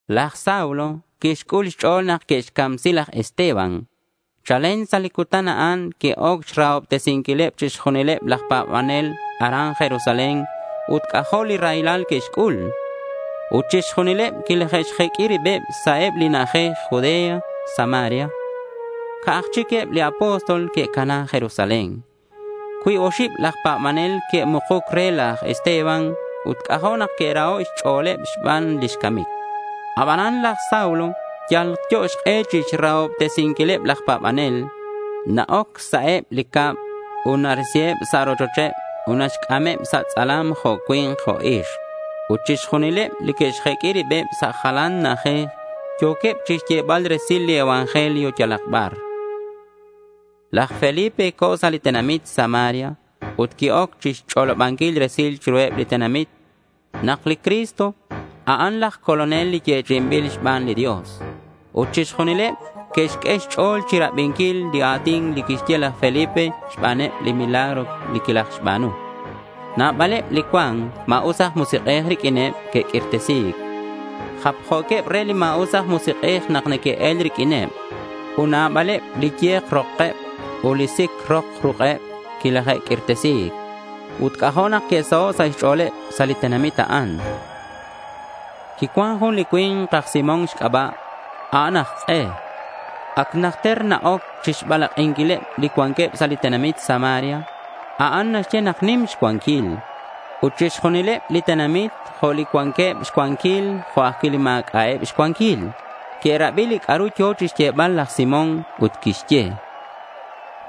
Laj Saulo quixc'ul xch'o̱l nak que'xcamsi laj Esteban. Chalen sa' li cutan a'an que'oc xrahobtesinquileb chixjunileb laj pa̱banel aran Jerusalén ut c'ajo' li raylal que'xc'ul. Ut chixjunileb quilaje'xjeq'ui rib sa' eb li na'ajej Judea ut Samaria. Ca'aj chic eb li apóstol que'cana Jerusalén. Cuib oxib laj pa̱banel que'mukuc re laj Esteban ut c'ajo' nak que'raho' xch'o̱leb xban lix camic. Aban laj Saulo yalyo xk'e chixrahobtesinquileb laj pa̱banel. Na-oc sa' eb li cab ut narisiheb sa' rochocheb ut naxc'ameb sa' tz'alam, jo' cui̱nk jo' ixk. Ut chixjunileb li que'xjeq'ui ribeb sa' jalan na'ajej yo̱queb chixyebal resil li evangelio yalak bar. Laj Felipe co̱ sa' li tenamit Samaria ut qui-oc chixch'olobanquil resil chiruheb li tenamit nak li Cristo, a'an laj Colonel li yechi'inbil xban li Dios. Ut chixjunileb que'xq'ue xch'o̱l chirabinquil li a̱tin li quixye laj Felipe xbaneb li milagro quilajxba̱nu. Nabaleb li cuan ma̱us aj musik'ej riq'uineb que'q'uirtesi̱c. Japjo̱queb re li ma̱us aj musik'ej nak neque'el riq'uineb. Ut nabaleb li ye̱k rokeb ut li sic rok ruk'eb quilaje'q'uirtesi̱c. Ut c'ajo' nak que'saho' sa' xch'o̱leb sa' li tenamit a'an. Quicuan jun li cui̱nk aj Simón xc'aba'. A'an aj k'e. Ac najter na-oc chixbalak'inquileb li cuanqueb sa' li tenamit Samaria. A'an naxye nak nim xcuanquil. Ut chixjunileb li tenamit, jo' li cuanqueb xcuanquil jo' ajcui' li ma̱c'a'eb xcuanquil, que'rabi li c'a'ru yo̱ chixyebal laj Simón ut que'xye: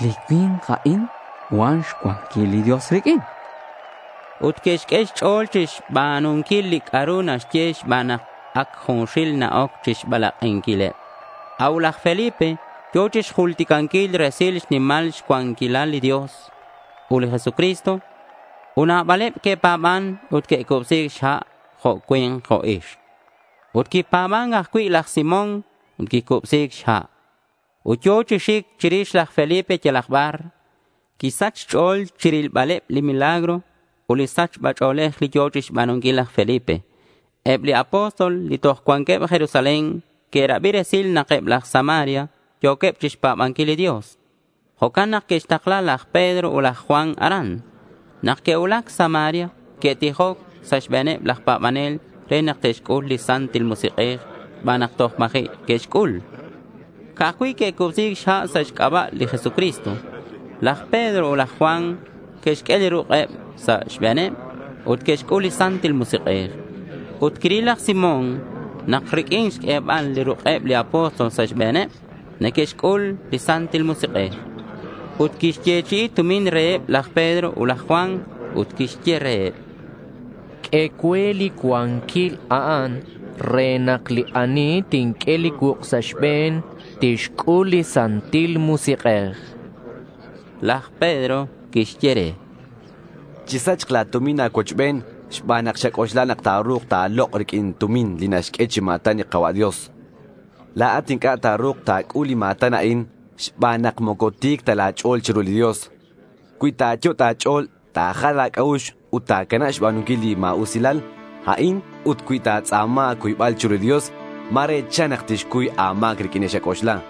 —Li cui̱nk a'in, cuan xcuanquil li Dios riq'uin, chanqueb. Ut que'xq'ue xch'o̱l chixba̱nunquil li c'a'ru naxye xban nak ac junxil na-oc chixbalak'inquileb. A'ut laj Felipe yo̱ chixjulticanquil resil xnimal xcuanquilal li Dios ut li Jesucristo. Ut nabaleb que'pa̱ban ut que'cubsi̱c xha', jo' cui̱nk jo' ixk. Ut quipa̱ban ajcui' laj Simón ut quicubsi̱c xha'. Ut yo̱ chi xic chirix laj Felipe yalak bar. Quisach xch'o̱l chirilbaleb li milagro ut li sachba ch'o̱lej li yo̱ chixba̱nunquil laj Felipe. Eb li apóstol li toj cuanqueb Jerusalén que'rabi resil nak eb laj Samaria yo̱queb chixpa̱banquil li Dios. Jo'can nak que'xtakla laj Pedro ut laj Juan aran. Nak que'cuulac Samaria, que'tijoc sa' xbe̱neb laj pa̱banel re nak te'xc'ul li Santil Musik'ej xban nak toj ma̱ji' que'xc'ul. Ca'aj cui' que'cubsi̱c xha' sa' xc'aba' li Jesucristo. Laj Pedro ut laj Juan que'xq'ue li ruk'eb sa' xbe̱neb ut que'xc'ul li Santil Musik'ej. Ut quiril laj Simón nak riq'uin xq'uebal li ruk'eb li apóstol sa' xbe̱neb, neque'xc'ul li Santil Musik'ej. Ut quixyechi'i tumin reheb laj Pedro ut laj Juan ut quixye reheb: —Q'ue cue li cuanquil a'an re nak li ani tinq'ue li cuuk' sa' xbe̱n tixc'ul li Santil Musik'ej, chan. Laj Pedro quixye re: —Chisachk la̱ tumin a̱cuochben xban nak xac'oxla nak ta̱ru̱k ta̱lok' riq'uin tumin li naxq'ue chi ma̱tan li Ka̱cua' Dios, chan. La̱at inc'a' ta̱ru̱k ta̱c'ul li ma̱tan a'in xban nak moco ti̱c ta la̱ ch'o̱l chiru li Dios. Cui ta̱yot' a̱ch'o̱l ta̱jal a̱c'a'ux ut ta̱canab xba̱nunquil li ma̱usilal a'in ut cui ta̱tz'a̱ma a̱cuybal chiru li Dios, ma̱re chan nak tixcuy a̱ma̱c riq'uin li xac'oxla.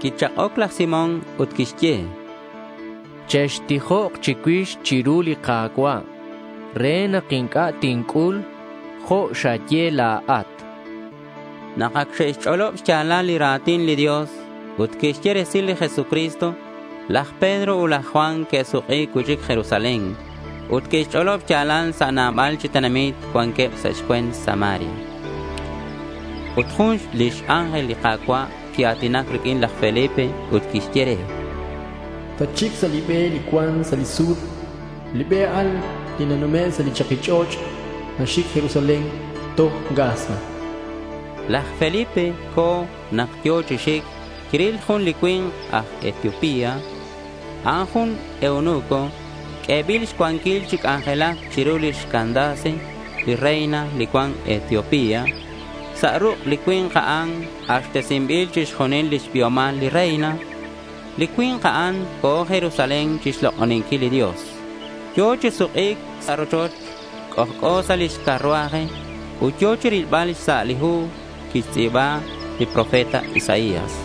Quichak'oc laj Simón ut quixye: —Chextijok chicuix chiru li Ka̱cua' re nak inc'a' tinc'ul jo' xaye la̱at, chan. Nak ac xe'xch'olob xya̱lal li ra̱tin li Dios ut que'xye resil li Jesucristo, laj Pedro ut laj Juan que'suk'i cui'chic Jerusalén. Ut que'xch'olob xya̱lal sa' nabal chi tenamit cuanqueb sa' xcue̱nt Samaria. Ut jun lix ángel li Ka̱cua' quia̱tinac riq'uin laj Felipe ut quixye re: —Tatxic sa' li be li cuan sa' li sur. Li be a'an li nanume' sa' li chaki ch'och' naxic Jerusalén toj Gaza.— Laj Felipe co̱. Nak yo̱ chi xic quiril jun li cui̱nk aj Etiopía. A'an jun eunuco q'uebil xcuanquil chi c'anjelac chiru lix Candace li reina li cuan Etiopía. Sa' ruk' li cui̱nk a'an k'axtesinbil chixjunil lix biomal li reina. Li cui̱nk a'an co̱ Jerusalén chixlok'oninquil li Dios. Yo̱ chi suk'i̱c sa' rochoch. C'ojc'o sa' lix carruaje ut yo̱ chirilbal xsa' li hu li quixtz'i̱ba li profeta Isaías.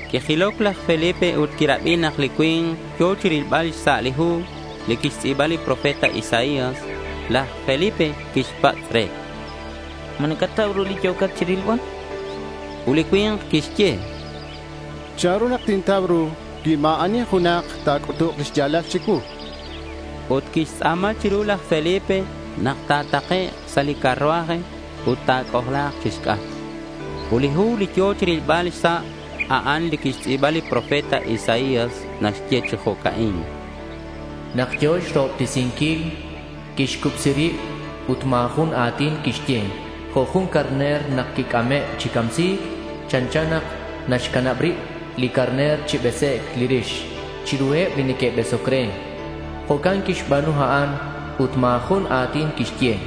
Quijiloc laj Felipe ut quirabi nak li cui̱nk yo̱ chirilbal xsa' li hu li quixtz'i̱ba li profeta Isaías. Laj Felipe quixpatz' re: —¿Ma nacatau ru li yo̱cat chirilbal? chan re. Ut li cui̱nk quixye: —¿Chanru nak tintau ru cui ma̱ ani junak ta̱c'utuk lix ya̱lal chicuu?— Ut quixtz'a̱ma chiru laj Felipe nak ta̱takek' sa' li carruaje ut ta̱c'ojla̱k chixc'atk. Ut li hu li yo̱ chirilbal xsa', a'an li quixtz'i̱ba li profeta Isaías. Naxye chi jo'ca'in: Nak yo̱ xrahobtesinquil, quixcubsi rib ut ma̱ jun a̱tin quixye jo' jun carner nak quic'ame' chi camsi̱c. Chanchan nak naxcanab rib li carner chi besec' li rix chiruheb li neque'besoc re, jo'can quixba̱nu a'an. Ut ma̱ jun a̱tin quixye.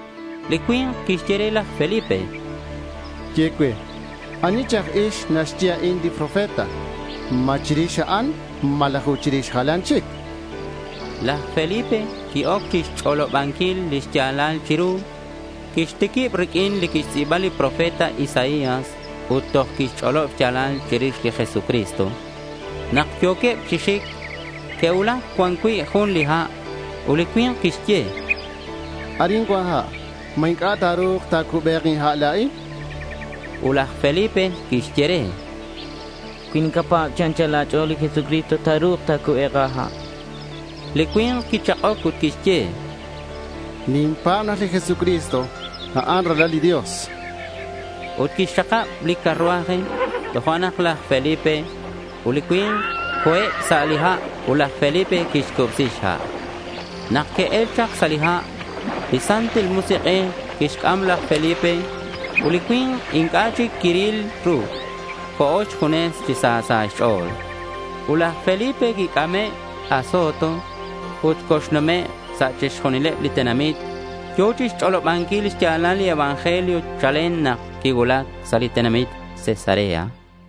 Li cui̱nk quixye re laj Felipe: —Ye cue, ¿ani chi aj ix naxye a'in li profeta? ¿Ma chirix a'an, malaj ut chirix jalan chic? chan. Laj Felipe qui-oc chixch'olobanquil lix ya̱lal chiru. Quixtiquib riq'uin li quixtz'i̱ba li profeta Isaías ut toj quixch'olob xya̱lal chirix li Jesucristo. Nak yo̱queb chi xic, que'cuulac cuan cui' jun li ha'. Ut li cui̱nk quixye: —Arin cuan ha'. ¿Ma inc'a' ta̱ru̱k ta̱cube̱k inha' la̱in? chan. Ut laj Felipe quixye re: —Cui nacapa̱b chi anchal a̱ch'o̱l li Jesucristo, ta̱ru̱k ta̱cube̱k a̱ha', chan. Li cui̱nk quichak'oc ut quixye: —Ninpa̱b nak li Jesucristo, a'an Ralal li Dios, chan. Ut quixxakab li carruaje. Tojo'nak laj Felipe ut li cui̱nk co̱eb sa' li ha' ut laj Felipe quixcubsi xha'. Nak que'el chak sa' li ha', li Santil Musik'ej quixc'am laj Felipe ut li cui̱nk inc'a' chic quiril ru. Co̱ xjunes chi sa sa' xch'o̱l. Ut laj Felipe quic'ame' Azoto ut coxnumek' sa' chixjunileb li tenamit. Yo̱ chixch'olobanquil xya̱lal li evangelio chalen nak quicuulac sa' li tenamit Cesarea.